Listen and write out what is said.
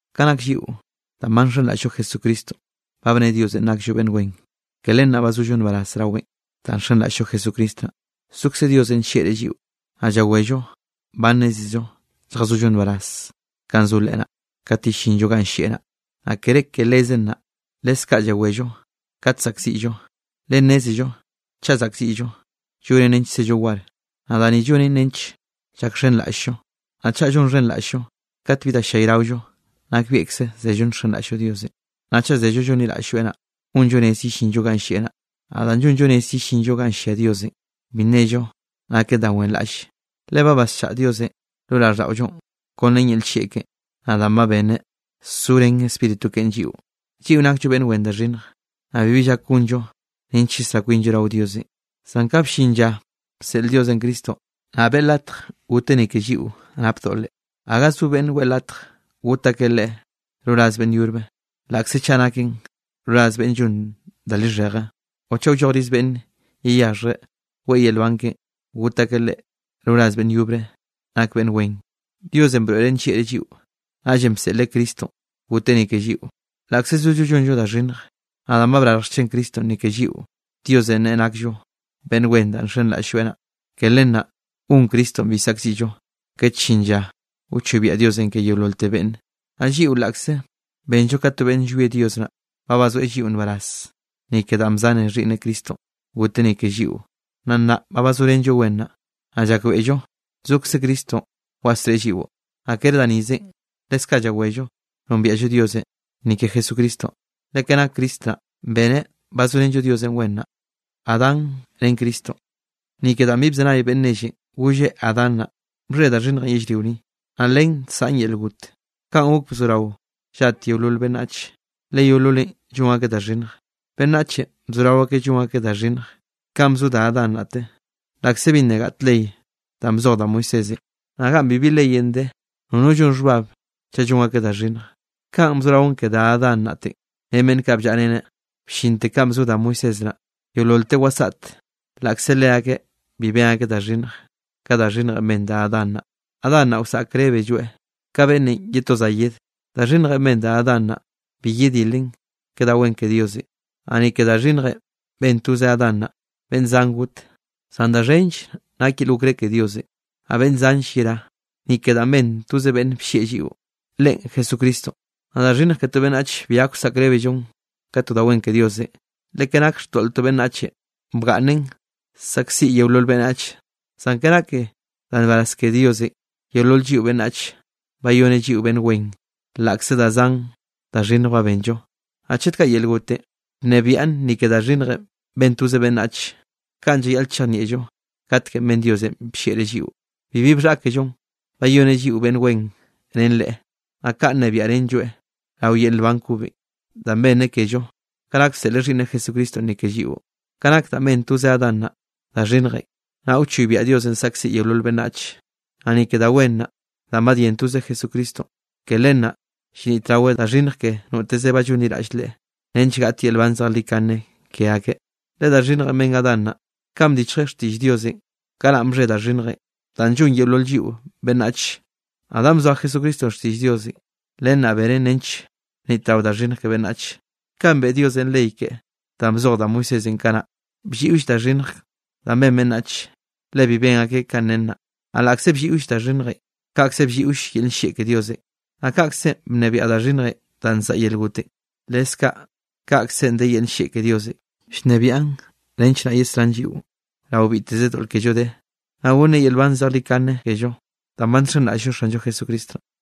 Ka nak lliꞌo, danꞌ ba nxenraꞌll-llo Jesucristonꞌ, ba bne Diosenꞌ nakllo beꞌnn wen, ke len naꞌ ba zollo nbaraz raweꞌn. Danꞌ nxenraꞌll-llo Jesucristo naꞌ, zokze Diosenꞌ nllieꞌreꞌ lliꞌo, naꞌ llawello ba nnézello lljazollo nbaraz kanꞌ zo Leꞌe naꞌ, kat yellinllo ganꞌ llieꞌ naꞌ. Naꞌ kere ke lezen naꞌ, leskaꞌ llawello kat zaꞌkziꞌllo, le nnézello chaꞌ zaꞌkziꞌllo, llonen nench zello war, naꞌ da ni llonen nench llakxhenraꞌll-llo. Naꞌ chaꞌ llonxhenraꞌll-llo kat bi da ll-llayraollo, nakbieꞌkze zello nxenraꞌll-llo Diosenꞌ. Naꞌ chaꞌ zello llonliraꞌll-lloeꞌ naꞌ, gonllo rez yellinllo ganꞌ llieꞌ naꞌ. Naꞌ danꞌ llonllo rez yellinllo ganꞌ llia Diosenꞌ, bi nnello naken da wenraꞌlle. Le ba basllaꞌa Diosenꞌ lo raꞌlldaꞌollonꞌ kon ren yel nllieꞌ keꞌen, danꞌ ba beneꞌ zorén Spíritu keꞌen lliꞌo. Lliꞌo nakllo beꞌnn wen da xhinnj, naꞌ bibi llak gonllo nench yesrá kwinllo rao Diosenꞌ, zan ka bllin lla bseꞌl Diosenꞌ Cristonꞌ, naꞌ beꞌe latj goteꞌ ni ke lliꞌo nap doꞌle. Gaga zo beꞌnne weꞌe latj got akeꞌ leꞌe roraz beꞌnn yobre, laꞌkze chaꞌ naken roraz beꞌnn llon da lixheje, o chaꞌ wllojriz beꞌnn yeyaxhjreꞌ weꞌe yel nban keꞌen got akeꞌ leꞌe roraz beꞌnn yobre nak beꞌnn wen. Diosenꞌ broeꞌreꞌ nllieꞌreꞌ lliꞌo, naꞌllenꞌ bseꞌleꞌ Cristonꞌ goteꞌ ni ke lliꞌo, laꞌkze zollo llonllo da xhinnj. Naꞌ danꞌ brarj xchen Cristonꞌ ni ke lliꞌo, Diosenꞌ neꞌe nakllo beꞌnn wen danꞌ nxenraꞌll-lloeꞌ naꞌ. Ke len naꞌ gon Cristonꞌ bi saꞌkziꞌllo kat llin lla wchoybiaꞌ Diosenꞌ ke yeololte beꞌnne. Naꞌ lliꞌo laꞌkze benllo ka to beꞌnn llwie Dios naꞌ, ba bazoeꞌ lliꞌo nbaraz, ni ke danꞌ bzane Xhiꞌnneꞌ Cristonꞌ goteꞌ ni ke lliꞌo. Naꞌ nnaꞌ ba bazorenlloeꞌ wen naꞌ, naꞌ llakbeꞌllo zokze Cristonꞌ wasreꞌe lliꞌo. Naꞌ kere da nizenꞌ, lekze kaꞌ llawello nombiaꞌllo Diosenꞌ ni ke Jesucristonꞌ, le ke nak Cristo naꞌ, beneꞌ bazorenllo Diosenꞌ wen naꞌ. Ni ke danꞌ bi bzenay beꞌnn nellenꞌ golle Adán naꞌ, bxhe da xhinnjenꞌ yellrio ni, naꞌ len nsaꞌn yel got. Kanꞌ gok, bzorao llat yeolol beꞌnnach, le yeololeꞌn llon akeꞌ da xhinnj. Beꞌnnachenꞌ bzorao akeꞌ llon akeꞌ da xhinnj kanꞌ bzo da Adán naꞌte, laꞌkze bi nna gaꞌt ley danꞌ bzoj da Moisésenꞌ. Naꞌ ganꞌ bibi leyenꞌ de, nono llon xhbab, chaꞌ llon akeꞌ da xhinnj. Kanꞌ bzoraon ke da Adán naꞌte ren beꞌnn kaꞌ bllaꞌreneꞌ, bllinte kanꞌ bzo da Moisés naꞌ, yeololteꞌ wasaꞌteꞌ laꞌkze leakeꞌ bi ben akeꞌ da xhinnj ka da xhinnjenꞌ ben da Adán naꞌ. Adán naꞌ wsaꞌkrébelloeꞌ ka beꞌnnenꞌ ye to za yed. Da xhinnjenꞌ ben da Adán naꞌ, bi yedilen ke da wen ke Diosenꞌ. Naꞌ ni ke da xhinnjenꞌ ben toze Adán naꞌ, beꞌnn zan got. Zan da xhenll nak yel okré ke Diosenꞌ, naꞌ beꞌnn zanll yerá ni ke danꞌ ben toze beꞌnn bllieꞌ lliꞌo, Leꞌen Jesucristonꞌ. Naꞌ da xhinnj ke to beꞌnnach bi gak wsaꞌkrébellon ka da wen ke Diosenꞌ, le ke nake xtoꞌl to beꞌnnachenꞌ, bgaꞌnnen zaꞌkziꞌ yeolol beꞌnnach, zan ke nake da nbaraz ke Diosenꞌ, yeolol lliꞌo beꞌnnach bayoneꞌ lliꞌo beꞌnn wen, laꞌkze da zan da xhinnj ba benllo. Naꞌ chet kaꞌ yel gotenꞌ bnebiaꞌn ni ke da xhinnjenꞌ ben toze beꞌnnach, kaꞌn llayaꞌl chejnieꞌllo katkenꞌ ben Diosenꞌ bllieꞌreꞌ lliꞌo, bibi bxhaꞌkellonꞌ bayoneꞌ lliꞌo beꞌnn wen ren Leꞌe, naꞌ kaꞌ nnebiaꞌrenlloeꞌ rao yel nban kobenꞌ, danꞌ benneꞌ kello, ka nak bseꞌleꞌ Xhiꞌnneꞌ Jesucristonꞌ ni ke lliꞌo. Kanꞌ nak danꞌ ben toze Adán naꞌ da xhinnjenꞌ, naꞌ wchoybiaꞌ Diosenꞌ saꞌkziꞌ yeolol beꞌnnachenꞌ. Naꞌ ni ke da wen danꞌ badyén toze Jesucristonꞌ, ke len naꞌ llnitraweꞌ da xhinnj ke noteze ba llonliraꞌll Leꞌe, nench gaꞌt yel nban zejlikane ke akeꞌ. Le da xhinnjenꞌ ben Adán naꞌ, kanꞌ bdichjeꞌ xtiꞌll Diosenꞌ, kanaꞌn bxhe da xhinnjenꞌ danꞌ llon yeolol lliꞌo beꞌnnach. Naꞌ danꞌ bzoa Jesucristonꞌ xtiꞌll Diosenꞌ, len naꞌ beneꞌn nench bnitrao da xhinnj ke beꞌnnach. Kanꞌ beꞌe Diosenꞌ ley keꞌen danꞌ bzoj da Moisésenꞌ kanaꞌ, blliꞌoll da xhinnj da ben beꞌnnach, le bi ben akeꞌ kanꞌ nen naꞌ. Naꞌ laꞌkze blliꞌo da xhinnjenꞌ, kaꞌkze blliꞌoll yel nllieꞌ ke Diosenꞌ. Naꞌ kaꞌkzenꞌ bnebiaꞌ da xhinnjenꞌ danꞌ nsaꞌa yel gotenꞌ, leskaꞌ kaꞌkzenꞌ de yel nllieꞌ ke Diosenꞌ llnebiaꞌn nench naꞌ yesrán lliꞌo rao biteze doꞌl kello de, naꞌ gonneꞌ yel nban zejlikane kello, danꞌ ba nxenraꞌll-llo Xanllo Jesucristo naꞌ.